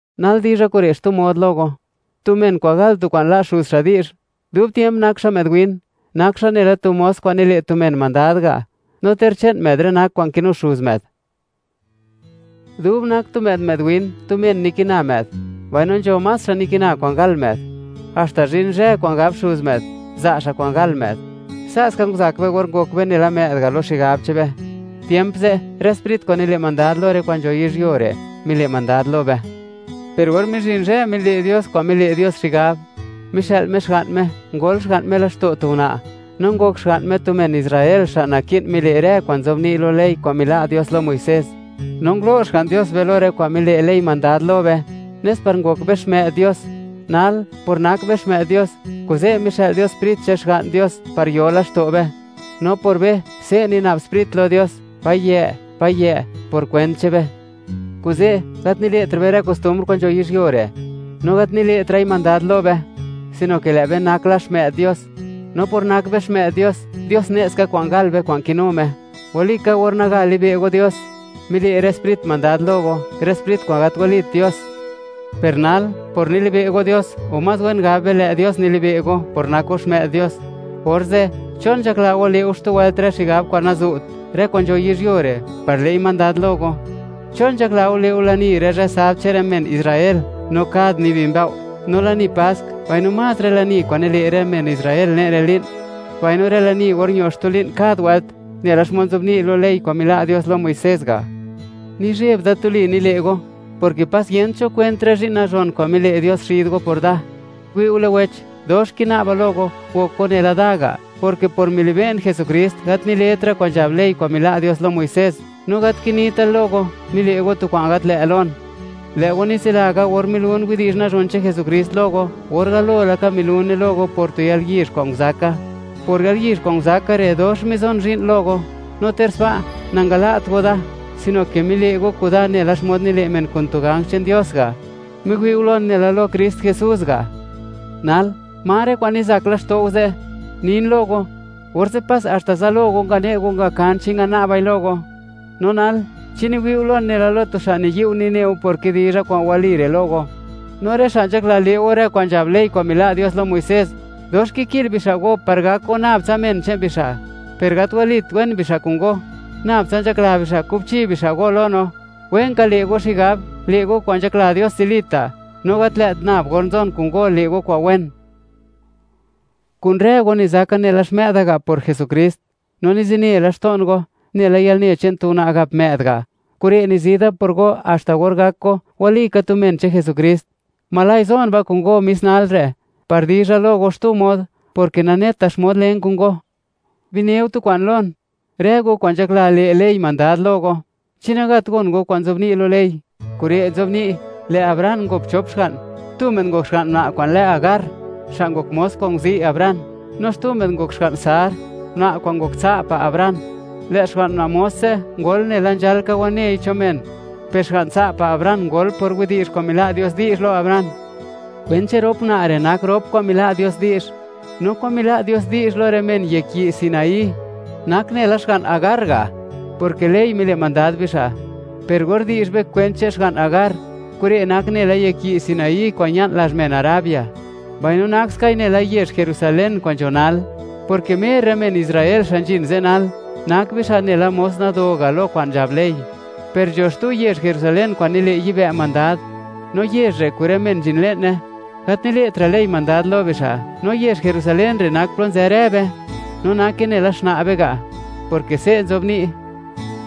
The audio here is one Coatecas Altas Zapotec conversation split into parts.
Nal dizha kure' xtu mod lo go: Tu men kwa'n gal tu kwa'n, la' xuz xa' di'zh; dub tiemp nak xa' më'd win, nak xa' nela tu mos kwa'n nile' tu men mandad ga', no ter che'n më'd rë nak kwa'n kinu xuz më'd. Dub nak tu më'd, më'd win, tu men nikina më'd; mbaino nzho más xa' nikina kwa'n gal më'd, haxta zhin zhë kwa'n gab xuz më'd, za' xa' kwa'n gal më'd. Se'ska nguzak be or ngok be nela më'd ga' lo xigab che'n be. Tiemp ze', rë sprit kwa'n nile' mandad lo rë kwa'n nzho yizhyuo re', mile' mandad lo be. Per or mizhin zhë mile' Dios kwa'n mile' Dios xigab, mixë'l Me Xga'n Me, ngol Xga'n Me laxto' tu una', no ngok Xga'n Me tu men Israel xa' naki'n mile' rë kwa'n nzobni' lo ley kwa'n mila' Dios lo Muisés. No ngulo' Xga'n Dios be lo rë kwa'n mile' ley mandad lo be, nes par ngok be xmë'd Dios. Nal, por nak be xmë'd Dios, kuze' mixë'l Dios Sprit che'n Xga'n Dios, par yo laxto' be, no por be, se' nina'b Sprit lo Dios: “¡Payë', Payë'!”, por kwent che'n be. Kuze', gat nile'tra' be rë kostumbr kwa'n nzho yizhyuo re', no gat nile'tra'i mandad lo be, sino ke lë'be nak la xmë'd Dios; no por nak be xmë'd Dios, Dios ne' ska kwa'n gal be, kwa'n kinu Me. Walika, or naga libe' go Dios, mile' rë sprit mandad lo go, rë sprit kwa'n gat walit dios. Per nal, por nilibe' go Dios, o más wen gab be, lë' Dios milibe' go por nak go xmë'd Dios, orze', ¿chon nzhakla go le' go xtu wëlt rë xigab kwa'n nazu't, rë kwa'n nzho yizhyuo re', par le'i mandad lo go? ¿Chon nzhakla go, le' go lani rë zhë sabd che'n rë men Israel, no kad nibi mbëo'; no lani Pask, mbaino más rë lani kwa'n nile' rë men Israel le'n rë li'n, mbaino rë lani or ño xtu li'n kad wëlt, nela xmod nzobni' lo ley kwa'n mila' Dios lo Muisés ga'? Nizheb da tuli nile' go, porke pas yent cho kwent rë zhi'n nazhon kwa'n mile' Dios xid go por da. Wi'ule wech, dox kina'ba lo go, gok go nela da ga', porke por milibe'n Jesukrist, gat niletra' kwa'n nzhab ley kwa'n mila' Dios lo Muisés, no gat kinita' lo go, mile' go tu kwa'n gat lë' lon. Lë' go nitsila ka, or milun widi'zh nazhon che'n Jesukrist lo go, or galo laka milune lo go por tu yalyizh kwa'n nguzaka. Por yalyizh kwa'n nguzaka re', dox mizon zhi'n lo go, no ter sba', nangala't go da, sino ke mile' go kuda nela xmod nile' men kun tu ganj che'n Dios ga', miwi'u lon nela lo Krist Jesús ga'. Nal, ¿ma rë kwa'n nizak laxto' go ze'? Nin lo go, orze' pas haxta zalo go ngane' go ngakan chi ngana'bai lo go. No nal, ¿chi niwi'u lon nela lo tu xa' niyi'u nineu por kidizha kwa'n wali re' lo go? No rë xa' nzhakla le' go rë kwa'n nzhab ley kwa'n mila' Dios lo Muisés, dox kiki'l bixa' go, par gak go nab tsa men che'n bixa'. Per gat walit wen bixa' kun go; nab tsa nzhakla bixa', kubchi bixa' go lo no. Wenka le' go xigab, le' go kwa'n nzhakla Dios zilita', no gat lë't nab or nzon kun go, le' go kwa'n wen. Kun rë go nizaka nela xmë'da ga' por Jesukrist, no nizine laxto'n go, nela yalne che'n tu una' gap më'd ga'; kure' nizi da por go haxta or gak go, walika tu men che'n Jesukrist. ¡Ojla' zon ba' kun go mis nalre'!, par dizha lo go xtu mod, porke naneta xmod len kun go. Bineu tu kwa'n lon, rë go kwa'n nzhakla, le' ley mandad lo go. ¿Chi nagat gon go kwa'n nzobni' lo ley? Kure' nzobni': Lë' Abraham ngop chop xga'n; tu më'd ngok xga'n una' kwa'n lë Hagar, xa' ngok mos kwa'n nguzi' Abraham; no xtu më'd ngok xga'n Sar, una' kwa'n ngok tsa' pa' Abraham. Lë' xga'n una' mos ze' ngol nela nzhalka wanei cho men, per xga'n tsa' pa' Abraham ngol por widi'zh kwa'n mila' Dios di'zh lo Abraham. Kwent che'n rop una' re' nak rop kwa'n mila' Dios di'zh. No kwa'n mila' Dios di'zh lo rë men yek yi' Sinaí nak nela xga'n Hagar ga', porke ley mile' mandad bixa'. Per or di'zh be kwent che'n xga'n Hagar, kure' nak nela yek yi' Sinaí kwa'n ña'n lazh men Arabia, mbaino nak skai nela yezh Jerusalén kwa'n nzho nal, porke mer rë men Israel xa' zhin ze' nal; nak bixa' nela mos nado ga' lo kwa'n nzhab ley. Per nzho xtu yezh Jerusalén kwa'n nile' yibë' mandad, no yezh re' kun rë men nzhin le'ne, gat nile'tra' ley mandad lo bixa', no yezh Jerusalén re' nak plo nzë rë be, no nake nela xna' be ga', porke se' nzobni':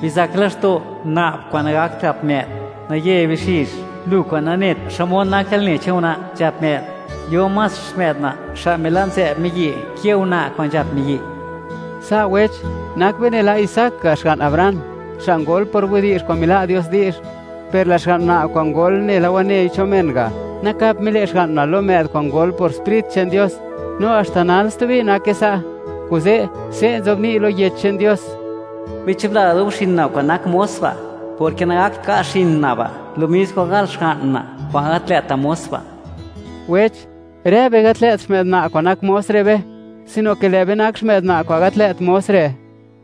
Bizak laxto', una' kwa'n nagakt gap më'd; naye bixizh, lu kwa'n nanet xmod nak yalne che'n una' nzhap më'd. Yo más xmë'd una', xa' mila' nzë'b miyi', ke una' kwa'n nzhap miyi'. Sa', wech, nak be nela Isaac ga', xga'n Abraham, xa' ngol por widi'zh kwa'n mila' Dios di'zh. Per lë' xga'n una' kwa'n ngol nela wanei cho men ga', nakap mile' xga'n una' lo më'd kwa'n ngol por Sprit che'n Dios, no haxta nal stubi nake sa'. Kuze', se' nzobni' lo Yech che'n Dios: “Bichubla dub xin una' kwa'n nak mos ba', porke nagakt ka' xin una' ba' lo mis kwa'n gal xga'n una' kwa'n gat lë't mos ba'.” Wech, rë be gat lë't xmë'd una' kwa'n nak mos re' be, sino ke lë' be nak xmë'd una' kwa'n gat lë't mos re'.